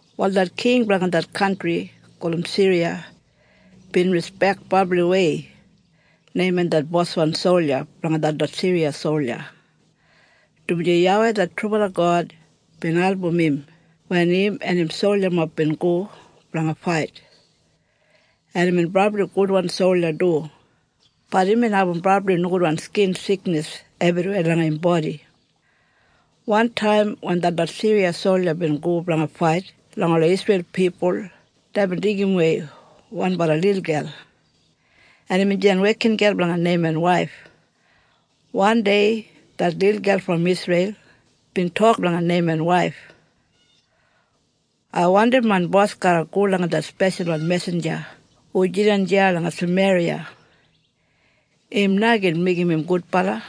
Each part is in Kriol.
Wal det king blanga det kantri gulum Siriya bin rispek brabliwei Neiman det boswan solja blanga detlot Siriya solja, dumaji YAWEI det trubala God bin album im wen im en im soljamob bin go blanga fait. En imbin brabli gudwan solja du, bat imbin abum brabli nogudwan skin siknis ebriweya langa im bodi. Wantaim wen detlot Siriya solja bin go blanga fait langa ola Isreil pipul deibin deigimwei wanbala lilgel, en imbin jidan wekingel blanga Neiman waif. Wandei det lilgel brom Isreil bin tok langa Neiman waif, “Ai wandim main bos garra go langa det speshalwan mesinja hu jidan deya langa Sameriya. Im na gin meigim im gudbala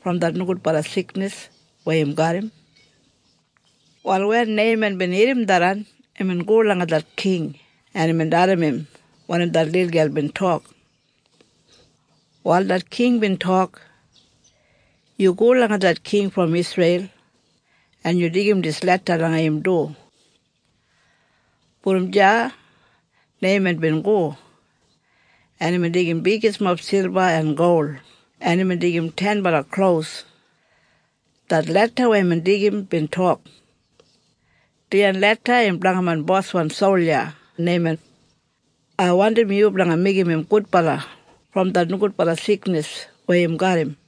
brom det nogudbala siknis weya im garram.” Wal wen Neiman bin irrim tharran imbin go langa det king en imbin dalim im wanim det lilgel bin tok. Wal det king bin tok, “Yu go langa det king brom Isreil en yu deigim dis leda langa im du.” Brom deya Neiman bin go, en imbin deigim bigismob silba en gol en imbin deigim tenbala klos. Det leda weya imbin deigim bin tok, “Dijan leda im blanga main boswan solja Neiman. Ai wandim yu blanga meigim im gudbala brom det nogudbala siknis weya im garram.”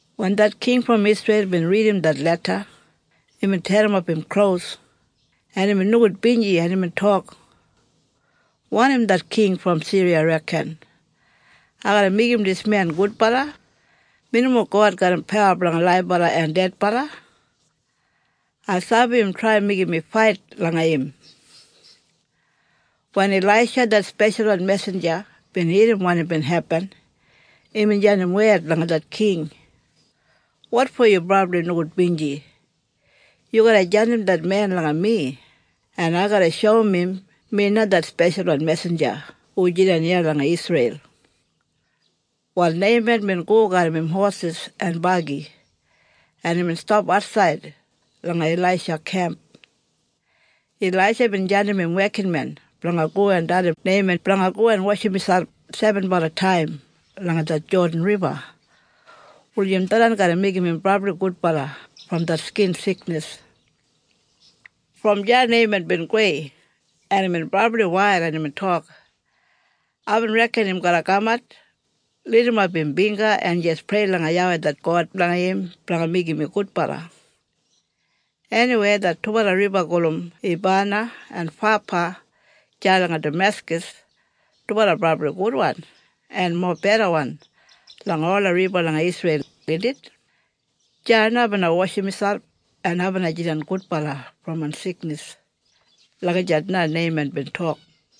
Wen det king brom Isreil bin ridim det leda imbin terrimap im klos en imbin nogudbinji en imbin tok, “Wanim det king brom Siriya reken, ai garra meigim dis men gudbala? Mi nomo God garram pawa blanga ola laibala en dedbala. Ai sabi im trai meigim mi fait langa im!” Wen Ilaisha det speshalwan mesinja bin irrim wanim bin hepin, imbin jandim wed langa det king, “Wotfo yu brabli nogudbinji? Yu garra jandim det men langa mi en ai garra shoum im mi na det speshalwan mesinja hu jidan iya langa Isreil.” Wal Neiman bin go garram im hosis en bagi en imbin stap atsaid langa Ilaisha kemp. Ilaisha bin jandim im wekinmen blanga go en dalim Neiman blanga go en washim miselp sebenbala taim langa det Jodan Riba, wulijim tharran garra meigim im brabli gudbala brom det skin siknis. Brom deya Neiman bin gowei en imbin brabli wail en imbin tok, “Aibin reken im garra kamat, lidimap im bingga en jis prei langa YAWEI det God blanga im blanga meigim mi gudbala. Eniwei det dubala riba gulum Ebana en Fapa deya langa Dameskas dubala brabli gudwan en mobedawan langa ola riba langa Isreil, indit? Deya na ai bina washim miselp en ai bina jidan gudbala brom main siknis.” Lagijat na Neiman bin tok.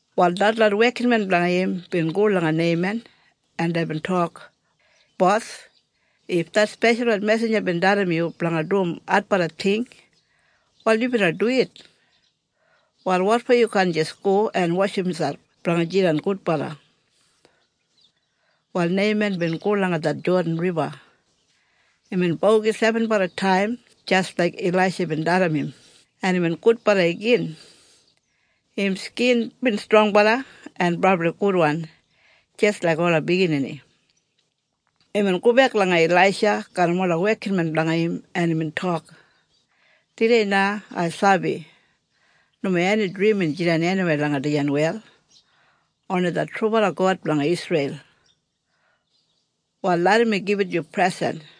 Wal detlot wekinmen blanga im bin go langa Neiman en deibin tok, “Bos, if det speshalwan mesinja bin dalim yu blanga dum adbala ting, wal yu bina duwit? Wal wotfo yu kaan jis go en washim miselp blanga jidan gudbala?” Wal Neiman bin go langa det Jodan Riba. Imbin bogi sebenbala taim jis laik Ilaisha bin dalim im en imbin gudbala igin. Im skin bin strongbala en brabli gudwan jis laik ola biginini. Imbin gobek langa Ilaisha garram ola wekinmen blanga im en imbin tok, “Tudei na ai sabi nomo eni drimin jidan eniweya langa dijan wel, oni det trubala God blanga Isreil. Wal larram mi gibit yu presen.”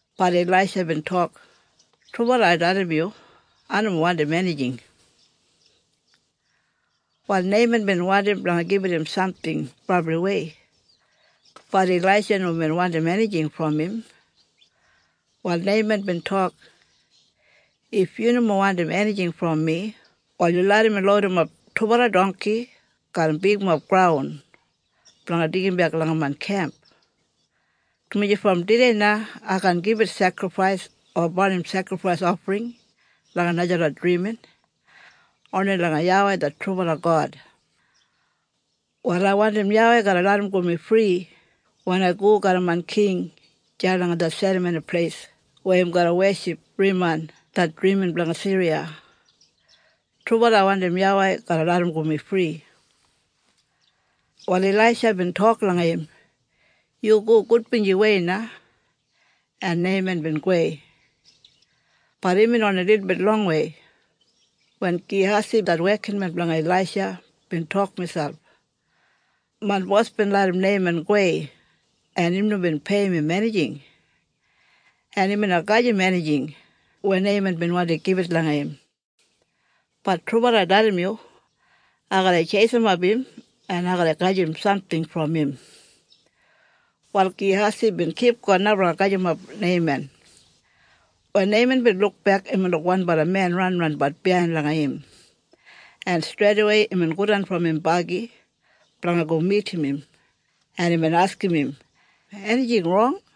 Bat Ilaisha bin tok, “Trubala ai dalim yu. Ai nomo wandim enijing.” Wal Neiman bin wandim blanga gibit im samting brabliwei. Bat Ilaisha nomo bin wandim enijing brom im. Wal Neiman bin tok, “If yu nomo wandim enijing brom mi wal yu larram mi loudimap dubala dongki garram bigmob graun blanga deigimbek langa main kemp, dumaji brom tudei na ai kaan gibit sekrifais o barnim sekrifais ofring langa najalot drimin, oni langa YAWEI det trubala God. Wal ai wandim YAWEI garra larramgo mi fri wen ai go garram main king deya langa det serramoni pleis weya im garra weship Riman det drimin blanga Siriya. Trubala ai wandim YAWEI garra larramgo mi fri.” Wal Ilaisha bin tok langa im, “Yu go gudbinjiwei na.” En Neiman bin gowei. Bat imbin oni lilbit longwei, wen Gehasi det wekinmen blanga Ilaisha bin tok miselp, “Main bos bin larram Neiman gowei en im nomo bin peiyim im enijing! En im bina gajim enijing weya Neiman bin wandi gibit langa im. Bat trubala ai dalim yu. Ai garra tjeisimap im en ai garra gajim samting brom im.” Wal Gehasi bin kipgon na blanga gajimap Neiman. Wen Neiman bin lukbek imbin luk wanbala men ranranbat biyain langa im en streidawei imbin godan brom im bagi blanga go midim im en imbin askim im, “Enijing rong?”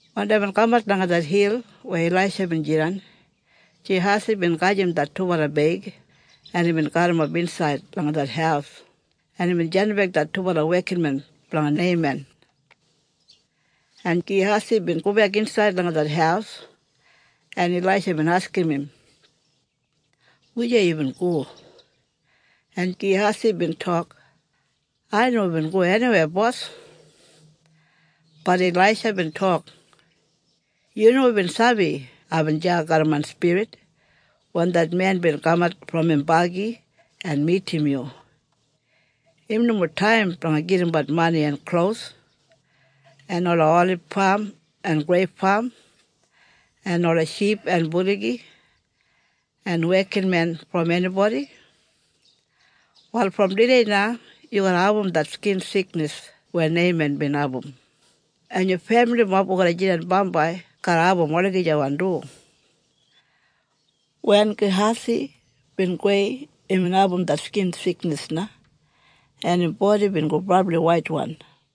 Wen deibin kamat langa det hil weya Ilaisha bin jidan, Gehasi bin gajim det dubala beig en imbin garrimap insaid langa det haus, en imbin jandimbek det dubala wekinmen blanga Neiman. En Gehasi bin gobek insaid langa det haus, en Ilaisha bin askim im, “Wujei yubin go?” En Gehasi bin tok, “Ai nomo bin go eniweya bos.” Bat Ilaisha bin tok, “Yu nomo bin sabi aibin deya garram main spirit wen det men bin kamat brom im bagi en midim yu? Im nomo taim blanga gedimbat mani en klos, en ola olib fam en greip fam, en ola ship en buligi en wekinmen brom enibodi. Wal brom tudei na yu garra abum det skin siknis weya Neiman bin abum, en yu femilimob hu garra jidan bambai garra abum olagijawan du.” Wen Gehasi bin gowei imbin abum det skin siknis na en im bodi bin go brabli waitwan.